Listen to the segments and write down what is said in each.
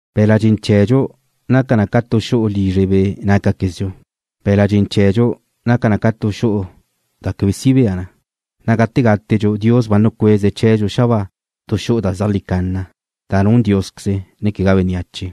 Be̱la' dxen chee̱dxu naca na ca tu xu'u lizre be' nácaquezdxu. Be̱la' dxen chee̱dxu naca na ca tu xu'u da quebe si bea na, na' gate gátedxu Dios ba nucueze̱' chee̱dxu xabáa tu xu'u da zea jlí canna, da nun Diósqueze, ne quegá bénneache.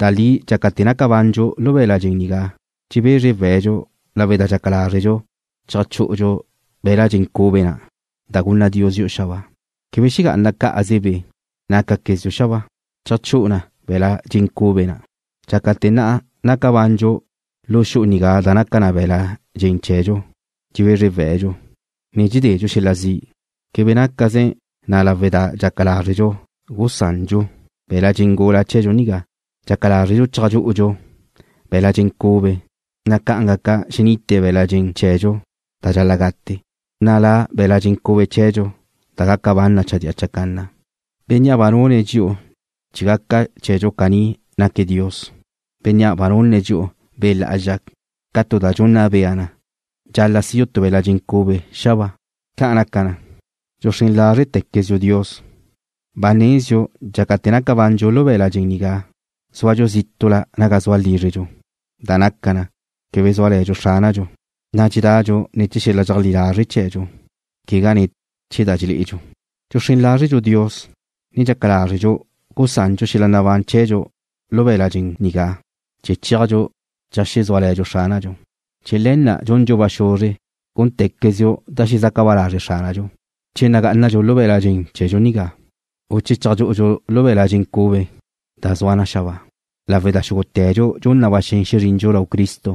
Da li dxácate̱ naca bandxu lu be̱la' dxen nigá dxebezre we̱'dxu lawe' da dxaca lázredxu cheajchú'udxu be̱la' dxen cube na' da gunna Dios dxi'u xabáa. Quebe xegá'ana cá'aze be' nácaquezdxu xabáa. Cheajchú'u na be̱la' dxen cube na'. Dxácate̱ ne naca bandxu lu xu'u nigá da naca na be̱la' dxen chee̱dxu, dxebezre we̱'dxu, ne dxededxu xel-la zi'. Quebe nácaze na lawe' da dxaca lázredxu gusandxu be̱la' dxen gula chee̱dxu nigá. Dxaca lázredxu cheajchú'udxu be̱la' dxen cube, na' ca'an gaca xenite be̱la' dxen chee̱dxu da dxal-la' gate, na' la' be̱la' dxen cube chee̱dxu da gaca ban na chadía chacanna. Bénnea' ba nune̱' dxi'u chee̱ gaca chee̱dxu caní naque̱' Dios, Bénnea' ba nunne̱' dxi'u Be' Lá'azxa ca tu da dxunna bea na dxal-la' sidxu tu be̱la' dxen cube xabáa. Ca' naca na, dxuxrén lázretequezdxu Dios. Ba nezdxu dxácate̱ naca bandxu lu be̱la' dxen nigá zúadxu zítu'la naga zua lízredxu, da naca na, quebe zúale̱dxu Xránadxu, na' dxedadxu ne̱ chee̱ xel-la dxeajlí lazre' chee̱dxu, quegá ne̱ chee̱ da dxelé'edxu. Dxuxrén lázredxu Dios, ne dxaca lázredxadxu gusandxu xel-la nabán chee̱dxu lu be̱la' dxen nigá chee̱ chéajdxu cheajsúale̱dxu Xránadxu. Chee̱ le̱ na' dxundxu ba xuzre gúnte̱quezdxu da xezaca ba lazre' Xránadxu, che nagá'anadxu lu be̱la' dxen chee̱dxu nigá, u che cheajchú'udxu be̱la' dxen cube, da zua na xabáa, lawe' da xúgute̱dxu dxun na ba xen xezrindxu lau Cristo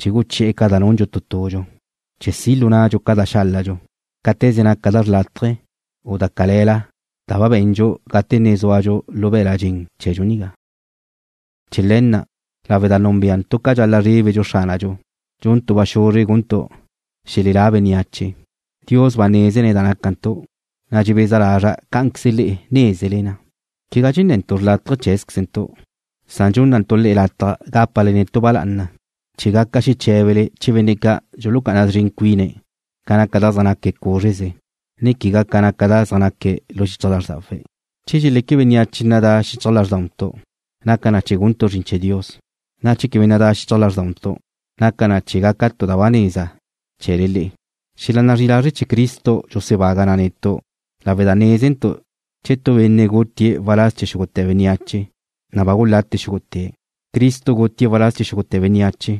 chee̱ guchi'e̱ ca da nundxu tu tudxu, chee̱ si' lu nadxu ca da xáladxu, cáte̱ze naca da xrlátaje, u da cale̱la da ba be̱ndxu gate ne zúadxu lu be̱la' dxen chee̱dxu nigá. Chee̱ le̱ na', lawe' da núnbeantu' ca dxal-la' zrébedxu Xránadxu, dxuntu' ba xuzre guntu' xelelá bénneache. Dios ba nézene̱' da nácantu', na' dxebeza lazra' cá'anqueze le'e nézele na. Quegá dxenne̱ntu' xrlátaje cheé̱zquezentu', san dxúnnantu' le'e lataj gápale netu' ba lá'ana, chee̱ gaca xeché̱bele chee̱ benne' ca' dxulucá'ana szren cuine̱' ca naca da zaj naque̱' cúzreze, ne quegá ca naca da zaj naque̱' lu xichaj lázrdawe̱'. Che dxeleque bénneache nadá xichaj lázrdauntu' naca na chee̱ guntu' zrin chee̱ Dios, na' che quebe nadá xichaj lázrdauntu' naca na chee̱ gaca tu da ba neza chee̱le le'e. Xel-la zri'i lazre' chee̱ Cristo dxusebaga na netu' lawe' da nézentu' che tu benne' gutie̱' waláz chee̱ xúgute̱ bénneache, na' ba gulate xúgute̱'. Cristo gutie̱' waláz chee̱ xúgute̱ bénneache,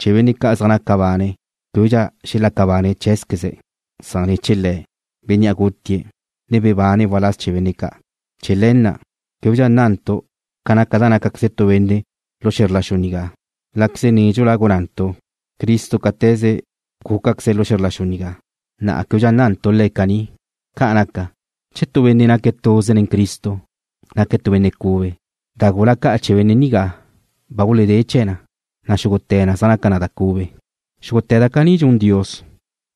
chee̱ benne' ca' zaj naca bane̱' québedxa xelaca bane̱' cheé̱zqueze̱', san chee̱ Le̱', Bénnea' gutie̱', ne bebane̱' waláz chee̱ benne' ca'. Chee̱ le̱ na', québedxa nna'ntu' ca naca da nácaqueze tu benne' lu xe̱zr la xu nigá, na' láqueze nédxula gunna'ntu' Cristo cáte̱ze gúcaqueze̱' lu xe̱zr la xu nigá, na'a québedxa nna'ntu' Le̱' caní. Ca' naca, che tu benne' naque̱' tuze nen Cristo, naque̱' tu benne' cube. Da gula ca' chee̱ benne' nigá ba guledé chee̱ na, na' xúgute̱ na zaj naca na cube. Xúgute̱ da caní dxun Dios,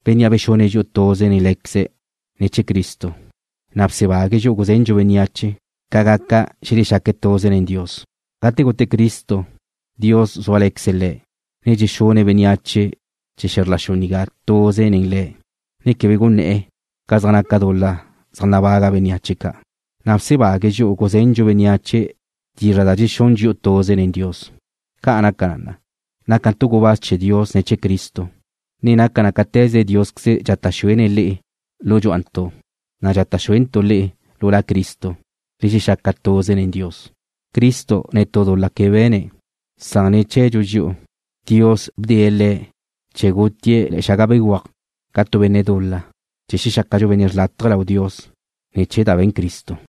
Bénnea' bexune̱' dxi'u tuze nen Lé̱queze̱' ne̱ chee̱ Cristo, na' bsebague̱' dxi'u guzendxu bénneache ca gaca xelexaque̱' tuze nen Dios. Gate gute Cristo, Dios guzúale̱queze̱' Le̱', ne bexune̱' bénneache chee̱ xe̱zr la xu nigá tuze nen Le̱', ne quebe gunné̱'e̱ ca zaj naca dul-la zaj nabaga bénneache ca', na' bsebague̱' dxi'u guzendxu bénneache dizra' da dxexún dxi'u tuze nen Dios. Ca' naca na, nácantu' gubáz chee̱ Dios ne̱ chee̱ Cristo, na' naca na cáte̱ze Diósqueze dxata' xuene̱' le'e lu dxúa'antu', na' dxata' xuentu' le'e lu La Cristo, le xexaca tuze nen Dios. Cristo netú dul-la ca be̱ne̱', san ne̱ chee̱dxu dxi'u, Dios bdee̱' Le̱' chee̱ gutie̱' le̱'e̱ xaga béguaj ca tu benne' dul-la, chee̱ xexácadxu benne' xrlátaje lau Dios ne̱ chee̱ da be̱n Cristo.